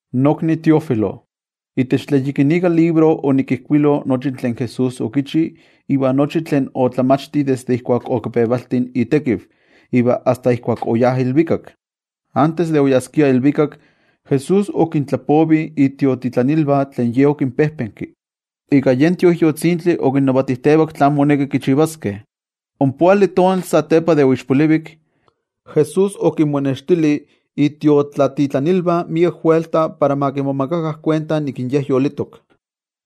Nokni Teófilo, itech tlen yikinika libro, onikijkuilo nochi tlen Jesús okichi iva nochi tlen otlamachti desde ijkuak okipevalti itekiv, iva asta ijkuak oyá ilvikak. Antes de oyaskia ilvikak, Jesús okintlapovi itiotlatitlanilvah tlen Ye okinpejpenki. Iva ika yen Tioijyotzintli okinnavatijtevak tlán moneki kichivaskeh. Ompoali tonaltih satepa de oixpolivik, Jesús okinmonextili itiotlatitlanilvah miek welta para ma kimomakakah kuenta nik in Ye yolitok.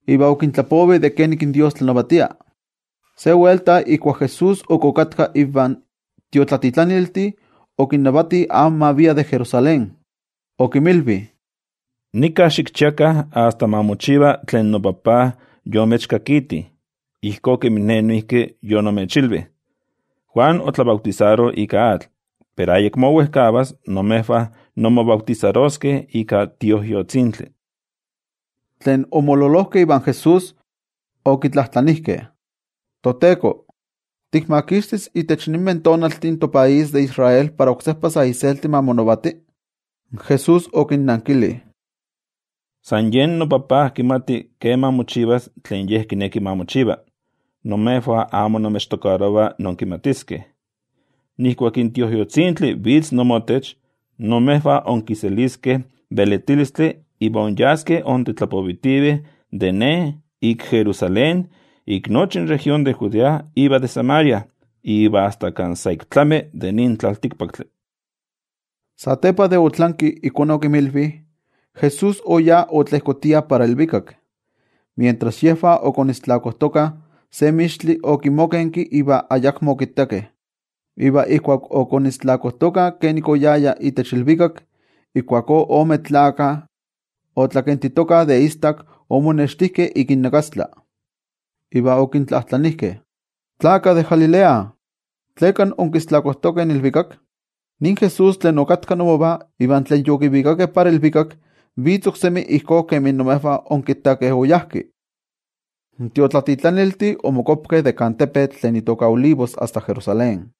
Iva okintlapovi de kenik tlanavatia in Dios. Se welta ijkuak Jesús ok okatka invan tiotlatitlaniltih, okinnavati amo ma viah de Jerusalén. Okinmilvi: —Nika xikchiakah asta ma mochiva tlen noTajtzi yomechkakiti, ijkó kemin Ne noijki yonimechilvi. Juan otlabautisaro ika atl, pero ayakmo wejkavas imejvah inmobautisaroskeh ika Tioijyotzintli. Tlen omololojkeh ivan Jesús, okitlajtlanijkeh: —ToTeko, ¿tikmakixtis itech ninmeh tonaltih in topaís de Israel para oksejpa sa iselti ma monavati? Jesús okinnankili: —San yen noTajtzi kimati keman mochivas tlen Ye kineki ma mochiva. Imejvah amo inmechtokarova inkimatiskeh. Ijkuak in Tioijyotzintli vitz inmotech, imejvah inkiseliskeh velitilistli iva inyaskeh intetlapovitivih de Ne ik Jerusalén, ik nochi in región de Judea iva de Samaria, iva asta kan sa ik tlami in tlaltikpaktli. Satepa de otlanki ijkó okinmilvi, Jesús oyá otlejkotia para ilvikak. Mientras yejvah okajkovitokah, se mixtli okimokenki iva ayakmo okittakeh. Iva ijkuak ok okajkovitokah kenomi nik oyaya itech ilvikak, ijkuakó ome tlakah tlakentokeh de istak omonextijkeh ik innakastla, iva okintlajtlanijkeh: —Tlakah de Galilea, ¿tleka onkajkovitokeh in ilvikak? Nin Jesús tlen okatka inmovah iva tlen yokivikakeh para ilvikak, vitz oksemi ijkó kemi imejvah onkittakeh oyá. In tiotlatitlaniltih omokuapatoh de kan tepetl tlen itoka Olivos iva oyajkeh para Jerusalén,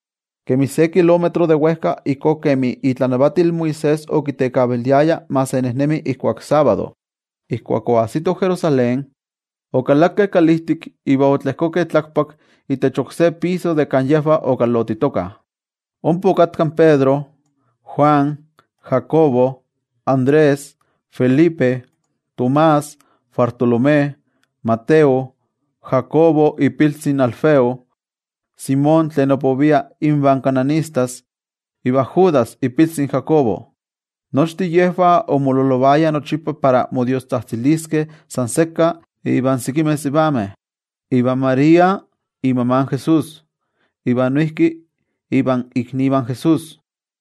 kemi se kilómetro de wejka ijkó kemi itlanavatil Moisés okitekaviliaya ma se nejnemi ijkuak sábado. Ijkuak oajsitoh Jerusalén, okalakeh kalijtik iva otlejkokeh tlakpak itech oksé piso kan yejvah okalotitokah. Ompa okatka in Pedro, Juan, Jacobo, Andrés, Felipe, Tomás, Bartolomé, Mateo, Jacobo ipiltzi in Alfeo, Simón tlen opovia invan cananistas, iva Judas ipiltzi in Jacobo. Nochtin yejvah omololovayah nochipa para modiostzajtziliskeh san sekka ivan sekimeh sivameh, ivan María imama in Jesús, iva noijki ivan iknivah in Jesús.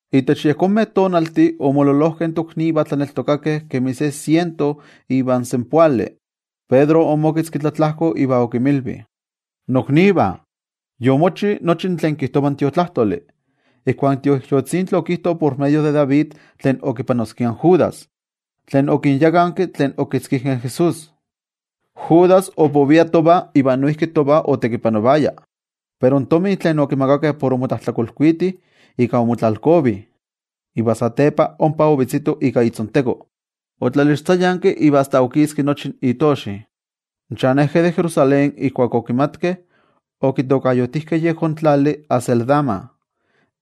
Itech yejonmeh tonaltih omololojkeh in toknivah tlaneltokakeh kemi se siento ivan senpoali. Pedro omoketzki tlatlajko iva okinmilvi: —Noknivah, yomochi tlen kijtova in Tiotlajkuiloli, ijkuak in Tioijyotzintli okijto por medio de David tlen okipanoskia in Judas, tlen okinyakanki tlen okitzkijkeh in Jesús. Judas opovia tovah iva noijki tovah otekipanovaya. Pero in tomi tlen okimakakeh por okichi tlen amo kuali, ika omotlalkovi. Iva satepa ompa ovetzito ika itzonteko, otlalixtzayanki iva asta okiski nochi itoxi. In chanejkeh de Jerusalén ijkuak okimatkeh, okitokayotijkeh yejón tlali Acéldama,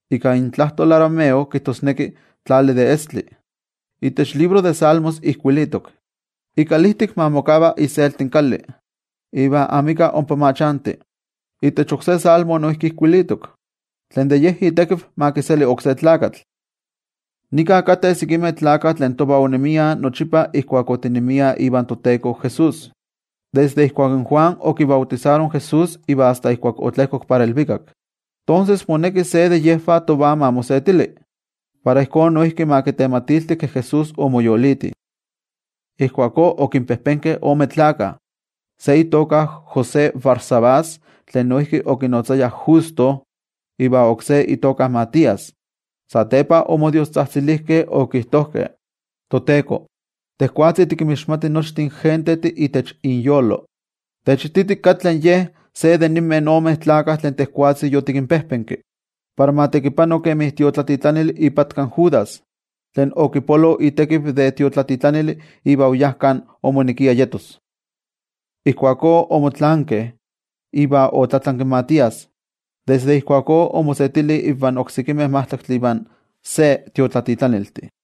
ika intlajtol arameo kijtosneki Tlali de Estli. Itech libro de Salmos ijkuilitok: Ikalijtik ma mokava iselti kali, iva amika ompa ma chanti. Itech oksé Salmo noijki ijkuilitok: Tlen de ye itekiv ma kiseli oksé tlakatl. ’Nika kateh sekimeh tlakah tlen tovah onemiah nochipa ijkuak otinemiah ivan toTeko Jesús, desde ijkuak in Juan okibautisaro in Jesús iva asta ijkuak otlejkok para ilvikak. Tonses moneki se de yejvah tovah ma mosetili, para ijkó tovah ma kitematilti ke Jesús omoyoliti. Ijkuakó okinpejpenkeh ome tlakah. Se itoka José Barsabás tlen okinotzayah Justo, iva oksé itoka Matías. Satepa omodiostzajtzilijkeh okijtojkeh: —ToTeko, tejwatzi tikinmixmati nochtin gentejtih itech inyolo, techititi katli ye de ninmeh ome tlakah tlen yotikpejpenki para ma tekipano kemi tiotlatitlanili ipatka in Judas, tlen okipolo itekiv de tiotlatitlanili iva oyá kan omonekia yetos. Ijkuakó omotlaankeh, iva otlatlanki in Matías, iva desde ijkuakó omosetili invan oksekimeh majtlaktli ivan se tiotlatitlaniltih.